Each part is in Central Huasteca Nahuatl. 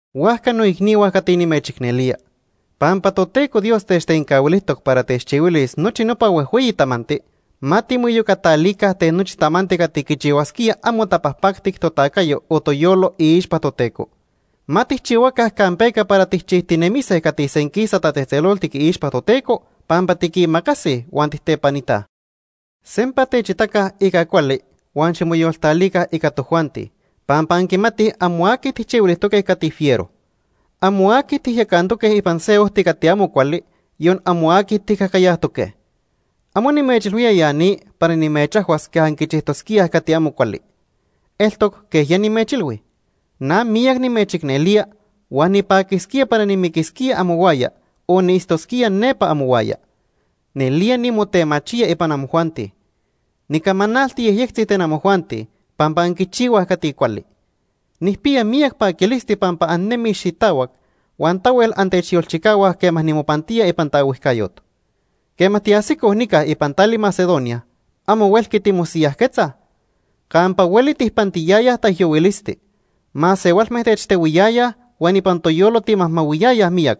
Huajca noicnihua cati nimechicnelía, pampa Toteco Dios techtencahuilijtoc para techchihuilis nochi nopa huejhueyi tamanti, ma timoiyocatalica ten nochi tamanti cati quichihuasquía amo tapajpactic totacayo o toyolo iixpa Toteco. Ma tijchihuaca campeca para tijchijtinemise cati senquisa tatzejtzeloltic iixpa Toteco pampa tiquimacasij huan tijtepanitaj. Sempa techitaca ica cuali huan ximoyoltalica ica tojuanti pampa anquimatij amo aqui tijchihuilijtoque cati fiero. Amo aqui tijyacantoque ipan se ojti cati amo cuali, yon amo aqui tijcajcayajtoque. Amo nimechilhuía ya ni para nimechajhuas quej anquichijtosquíaj cati amo cuali. Eltoc quej ya nimechilhui. Na miyac nimechicnelía huan nipaquisquía para nimiquisquía amohuaya o niitztosquía nepa amohuaya. Nelía nimotemachía ipan amojuanti. Nicamanalti yejyectzi ten amojuanti pampa anquichihuaj cati cuali. Nijpiya miyac paquilisti pampa annejnemij xitahuac huan tahuel antechyolchicahuaj quema nimopantía ipan taohuijcayot. Quema tiajsicoj nica ipan tali Macedonia, amo huelqui timosiyajquetzaj. Campa hueli tijpantiyayaj taijyohuilisti. Masehualme techtehuiyayaj huan ipan toyolo timajmahuiyayaj miyac.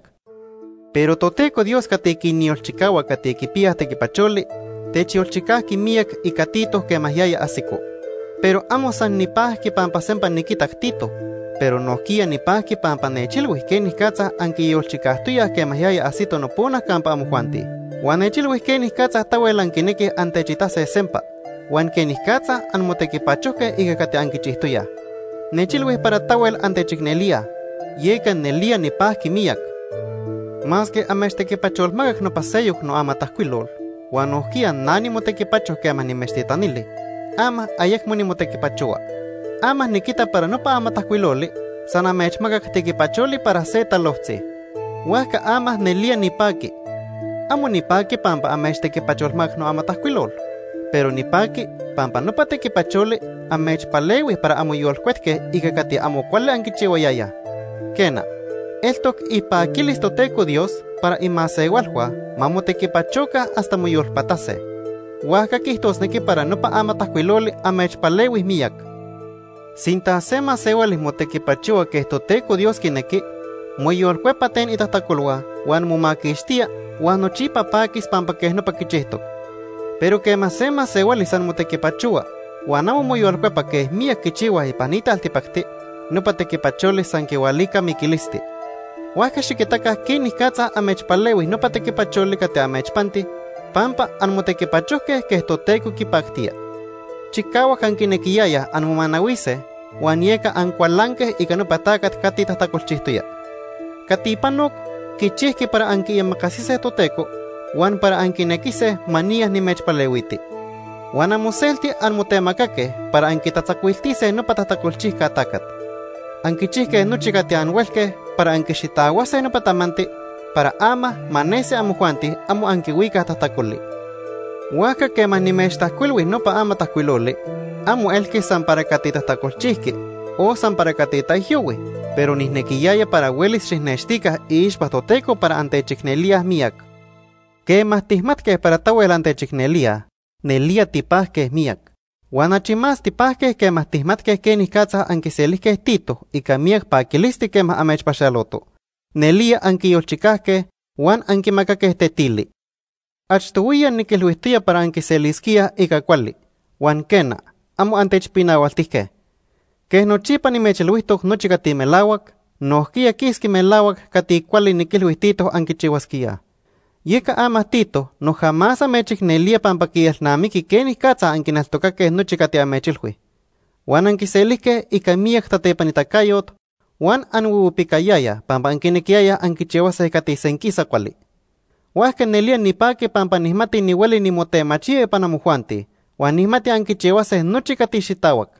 Pero Toteco Dios cati quinyolchicahua cati quipiyaj tequipacholi, techyolchicajqui miyac ica Tito quema yaya ajsico. Pero amo san nipajqui pampa sempa niquitac Tito, pero nojquiya nipajqui pampa nechilhui quenicatza anquiyolchicajtoyaj quema yaya ajsito nopona campa amojuanti. Huan nechilhui quenicatza tahuel anquinequij antechitase sempa, huan quenicatza anmotequipachojque ica cati anquichijtoyaj. Nechilhui para tahuel antechicnelíaj, yeca nelía nipajqui miyac. Masque amechtequipacholmacac nopa seyoc noamatajcuilol, huan nojquiya na nimotequipacho quema nimechtitanili, ama ayecmo nimotequipachohua. Ama niquita para nopa amatajcuiloli san amechmacac tequipacholi para se talojtzi. Huajca ama nelía nipaqui. Amo nipaqui pampa amechtequipacholmacac noamatajcuilol, pero nipaqui pampa nopa tequipacholi amechpalehui para anmoyolcuetque ica cati amo cuali anquichihuayayaj. Quena, eltoc ipaquilis Toteco Dios para imasehualhua ma motequipachoca hasta moyolpatase. Huajca quiijtosnequi para nopa amatajcuiloli amechpalehui miyac. Sinta se masehuali motequipachohua quej Toteco Dios quinequi, moyolcuepa ten itajtacolhua, huan momaquixtía huan nochipa paquis pampa quej nopa quichijtoc. Pero quema se masehuali san motequipachohua huan amo moyolcuepa quej miyac quichihuaj ipan ni taltipacti, nopa tequipacholi san quihualica miquilisti. Huajca xiquitaca quenicatza amechpalehui nopa tequipacholi cati amechpanti pampa anmotequipachojque quej Toteco quipactía. Chicahuac anquinequiyayaj anmomanahuise huan yeca ancualanque ica nopa tacat cati tajtacolchijtoya. Cati panoc quichijqui para anquiimacasise Toteco huan para anquinequise ma niya nimechpalehuiti. Huan amoselti anmotemacaque para anquitatzacuiltise nopa tajtacolchijca tacat. Anquichijque nochi cati anhuelque para anquixitahuase nopa tamanti para ama ma nesi amojuanti amo anquihuicaj tajtacoli. Huajca quema nimechtajcuilhui nopa amatajcuiloli, amo elqui san para cati tajtacolchijqui o san para cati taijyohui, pero nijnequiyaya para huelis xijnextica iixpa Toteco para antechicnelíaj miyac. Quema tijmatque para tahuel antechicnelíaj, nelía tipajque miyac. Huan achi más tipajque quema tijmatque quenicatza anquiselijque Tito ica miyac paquilisti quema amechpaxaloto. Nelía anquiyolchicajque huan anquimacaque tetili. Achtohuiya niquilhuijtoya para anquiselisquíaj ica cuali, huan quena, amo antechpinahualtijque. Quej nochipa nimechilhuijtoc nochi cati melahuac, nojquiya quisqui melahuac cati cuali niquilhui Tito anquichihuasquíaj. Yeca ama Tito noja más amechicnelía pampa quielnamiqui quenicatza anquineltocaque nochi cati amechilhui. Huan anquiselijque ica miyac tatepanitacayot huan anhuihuipicayayaj pampa anquinequiyayaj anquichihuase cati senquisa cuali. Huajca nelía nipaqui pampa nijmati nihueli nimotemachía ipan amojuanti, huan nijmati anquichihuase nochi cati xitahuac.